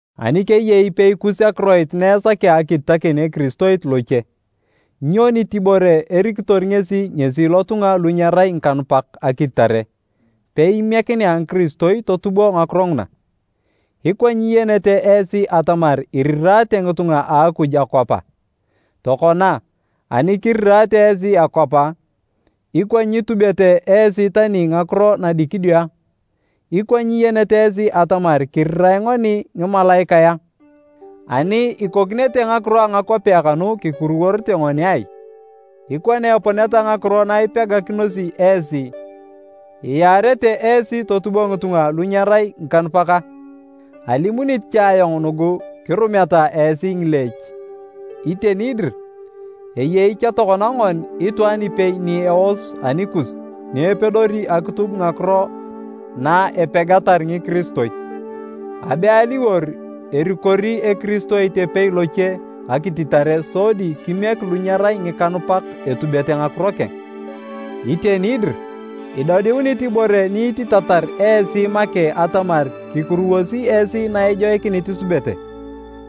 Ani keyei ipei kus akiroit na esakea akititakin ekiristoit loche, nyo nitibore erikitor ngesi ngesi lotunga lu nyerai ngikanupak akititare peimiekinea ngikiristoi totubo ngakiro nguna? Ikwa nyiyenete esi atamar iriraate ngitunga a Akuj akwap a? Tokona, ani kiriraate esi akwap a, ikwa nyitubete esi tani ngakiro nadikidio a? Ikwa nyiyenete esi atamar kirirae ngoni ngimalaikae a? Ani ikokinete ngakiro a ngakwapea kanu kikuruworete ngoni ai? Ikwa na eponeta ngakiro na ipegakinosi esi, iyaarete esi totubo ngitunga lu nyerai ngikanupak a? Alimunit cha ayong nugu kirumeta esi ngileech! Iteni dir, eyei cha tokona ngon itwaan ipei ni eos anikus ni epedori akitub ngakiro na epegatar ngikiristoi. Abe aliwor erikori ekiristoit epei loche akititare sodi kimiek lu nyerai ngikanupak etubete ngakiro keng! Iteni dir, idodiunit ibore ni ititatar esi make atamar kikuruwosi esi na ejoikinit isubete.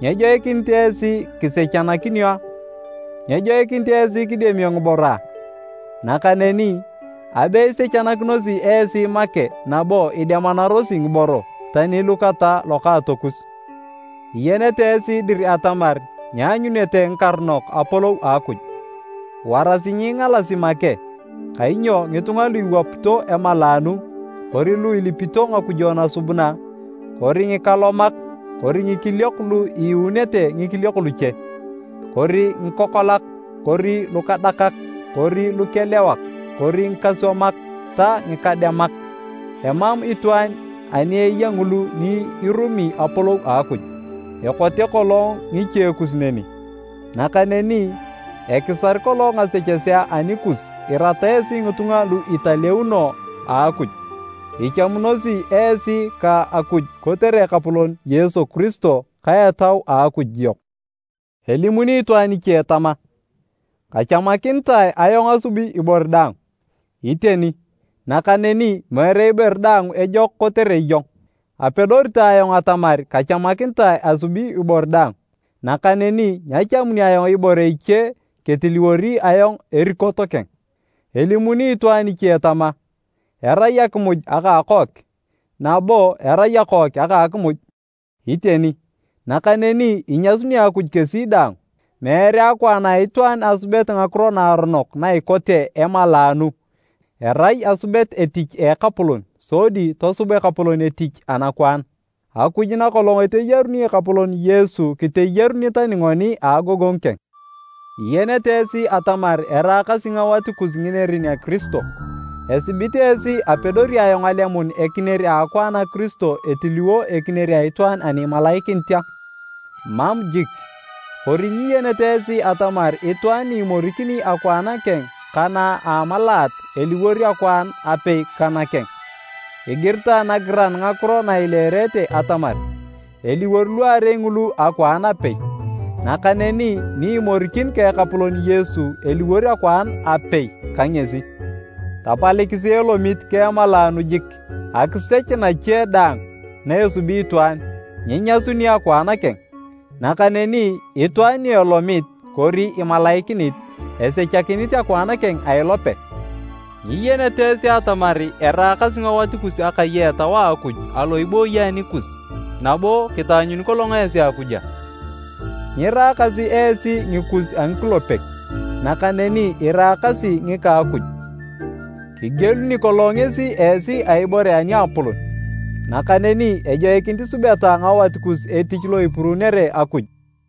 Nyejoikinit esi kisechanakinio a? Nyejoikinit esi kidemio ngiboro a? Nakaneni, abe isechakinosi esi make nabo idemanarosi ngiboro, tani lu kata lokaatokus! Iyenete esi dir atamar nyeanyunete ngikaronok Apolou a Akuj. Warasi nyiingalasi make kainyo ngitunga lu iwapito emalaanu, kori lu ilipito ngakujo nasubuna, kori ngikalomak kori ngikiliok lu iiunete ngikiliok luche, kori ngikokolak kori lukadakak, kori lukelewak kori ngikaswamak ta ngikademak, emam itwaan ani eya ngulu ni irumi Apolou a Akuj. Ekote kolong ngichekus neni. Nakaneni ekisar kolong ngasechesea anikus irata esi ngitunga lu italeuno a Akuj. Ichamunosi esi ka Akuj kotere Ekapolon Yesu Kiristo ka Etau a Akuj yok. Elimuni itwaan iche tama, “Kachamakinitae ayong asubi ibore daang.” Iteni, nakaneni meere ibore daang ejok kotere iyong. Apedori ta ayong atamar kachamakinitae asubi ibore daang, nakaneni nyachamuni ayong ibore iche ketiliwori ayong erikot keng. Elimuni itwaan iche tama, “Erai akimuj aka akook, nabo erai akook aka akimuj.” Iteni, nakaneni inyasuni Akuj kesi daang. Meere akwaan a itwaan asubet ngakiro naaronok na ikote emalaanu, erai asubet etich a Ekapolon sodi tosub Ekapolon etich anakwaan. Akuj nakolong eteyaruni Ekapolon Yesu kiteyaruni tani ngoni a agogongu keng. Iyenete esi atamar eraakasi ngawat kus nginerin a Kiristo. Esibit esi apedori ayong alemun ekinier a akwaan a Kiristo etiliwo ekinier a itwaan ani imalaikinit a? Mam jik! Kori nyiyenete esi atamar itwaan ni imorikini akwaan keng ka na a amalaat, eliwor akwaan apei ka nakeng. Igiritae nagiran ngakiro na ileerete atamar, “Eliwor luarei ngulu akwaan apei.” Nakaneni ni imorikin ka Ekapolon Yesu, eliwor akwaan apei ka ngesi. Tapalikisi elomit ka emalaanu jik! Akisech nache daang na esubi itwaan, nyinyasuni akwaan keng, nakaneni itwaan ni elomit kori imalaikinit, esechakinit akwaan keng a ilope. Nyiyenete esi atamar eraakasi ngawat kus akai a Etau a Akuj alo ibooyi anikus, nabo kitaanyuni kolong esi Akuj a? Nyiraakasi esi ngikus a ngikulepek, nakaneni iraakasi ngika a Akuj, kigieluni kolong ngesi esi a ibore aniapolon. Nakaneni ejoikinit isubeta ngawat kus etich lo ipuruunere Akuj.